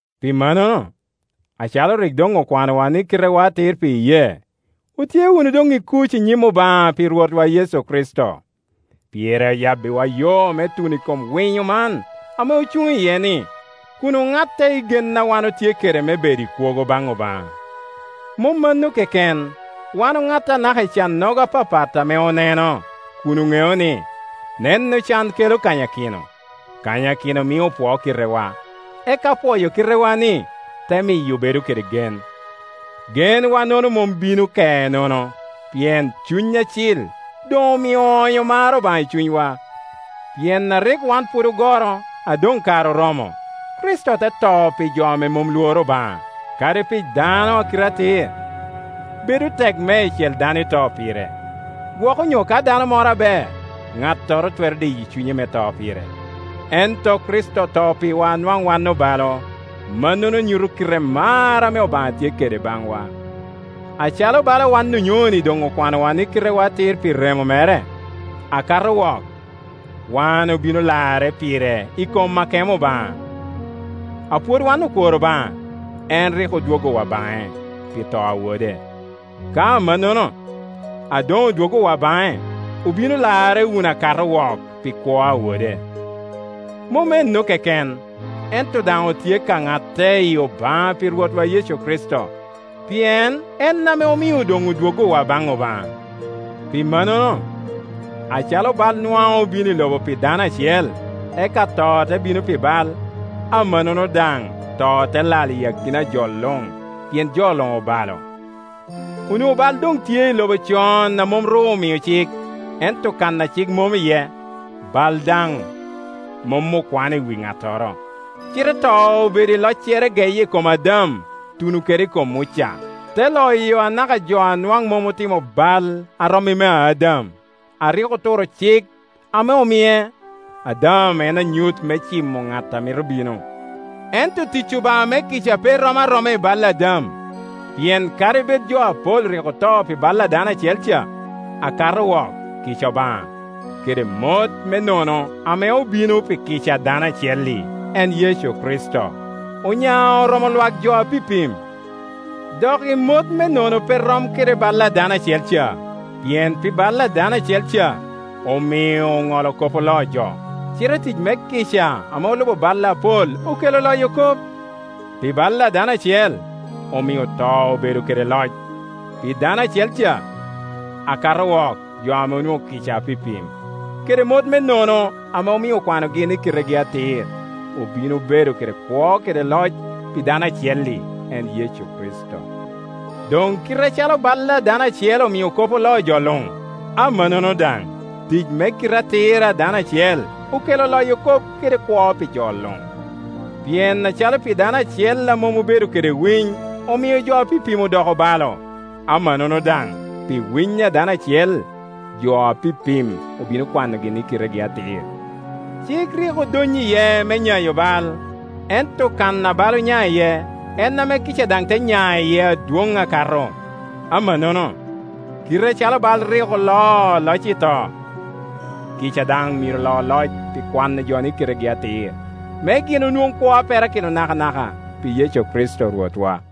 Pi mannono, acalo rik doŋ okwanowa ni kitewa atir pi iyee, otye wunu doŋ i kuc i nyim Obaŋa, pi Rwotwa Yecu Kricito. Pire oyabbiwa yo me tuno i kom winyo man ame ocuŋ iye-ni, kun oŋatte i gen a wan otye kede me bedo i kwogo baŋ Obaŋa. Mom mano keken, wan oŋatte anaka i cannogo apapat ame oneno, kun oŋeo ni, neno can kelo kanyakino, kanyakino mio opwoo kitewa, eka pwoyo kitewa-ni, te miyo obedo kede gen. Genwa-nono mom bino ke nono, pien Cuny Acil doŋomio oonyo mar Obaŋa i cunywa. Pien a rik wan pwod ogoro, a doŋkare oromo, Kricito te to pi jo a mom lworo Obaŋa. Kadi pi dano a kite atir, bedo tek meicel dano ito pire. Gwok onyo ka dano moro aber, ŋattoro twero diyo cunye me to pire. Ento Kricito oto pirwa a nwaŋ wan obalo; mannono nyuto kite mar ame Obaŋa tye kede baŋwa. Acalo bala wan onyoni doŋ okwanowa ni kitewa atir pi remo mere, akato wok wan obino larre pire i kom akemo Obaŋa. A pwod wan okwor Obaŋa, en rik odwoggowa baŋe, pi to a Wode; ka amannono, a doŋodwoggowa baŋe, obino larre wunu akato wok pi kwo a Wode. Mom ennu keken, ento daŋ otye ka ŋatte i Obaŋa pi Rwotwa Yecu Kricito, pien en ame omio doŋ odwoggowa baŋ Obaŋa. Pi mannono, acalo bal nwaŋ obino i lobo pi dano acel, eka to te bino pi bal, amannono daŋ to te lal i akina a jo luŋ, pien jo luŋ obalo. Onwoŋo bal doŋtye i lobo con a mom ru omio cik, ento kan a cik mom iye, bal daŋ mom okwano i wi ŋattoro. Cite to obedo i locere geye i kom Adam ituno kede i kom Muca, te loyo anaka jo a nwaŋ mom otimo bal a rom i mea Adam, a rik oturo cik ame omie. Adam en anyut me cimo ŋat a mito bino. Ento tic Obaŋa me kica pe rom aroma i bal a Adam; pien kadi bed jo apol rik oto pi bal a dano acel ca, akato wok kica Obaŋa, kede mot me nono ame obino pi kica a dano acel-li, en Yecu Kricito, onya oromo lwak jo apipim. Doki mot me nono pe rom kede bal a dano acel ca; pien pi bal a dano acel ca omio oŋolo kop oloo jo, cite tic me kica ame olubo bal apol okelo loyo kop. Pi bal a dano acel omio to obedo kede loc, pi dano acel ca; akato wok jo ame onwoŋo kica apipim, kede mot me nono ame omio okwanogi ni kitegi atir, obino bedo kede kwo kede loc, pi dano acel-li, en Yecu Kricito. Doŋ kite acalo bal a dano acel omio kop oloo jo luŋ, amannono daŋ, tic me kite atir a dano acel okelo loyo kop kede kwo pi jo luŋ. Pien acalo pi dano acel a mom obedo kede winy omio jo apipim odoko obalo, amannono daŋ pi winy a dano acel jo apipim obino kwanogi ni kitegi atir. Cik rik odonyo iye me nyayo bal; ento kan a bal onya iye, en ame kica daŋ te nya iye adwoŋ akato. Amannono, kite acalo bal rik oloo loc i to, kica daŋ myero lo loc pi kwano jo ni kitegi atir, me gin onwoŋ kwo a perakino nakanaka, pi Yecu Kricto Rwotwa.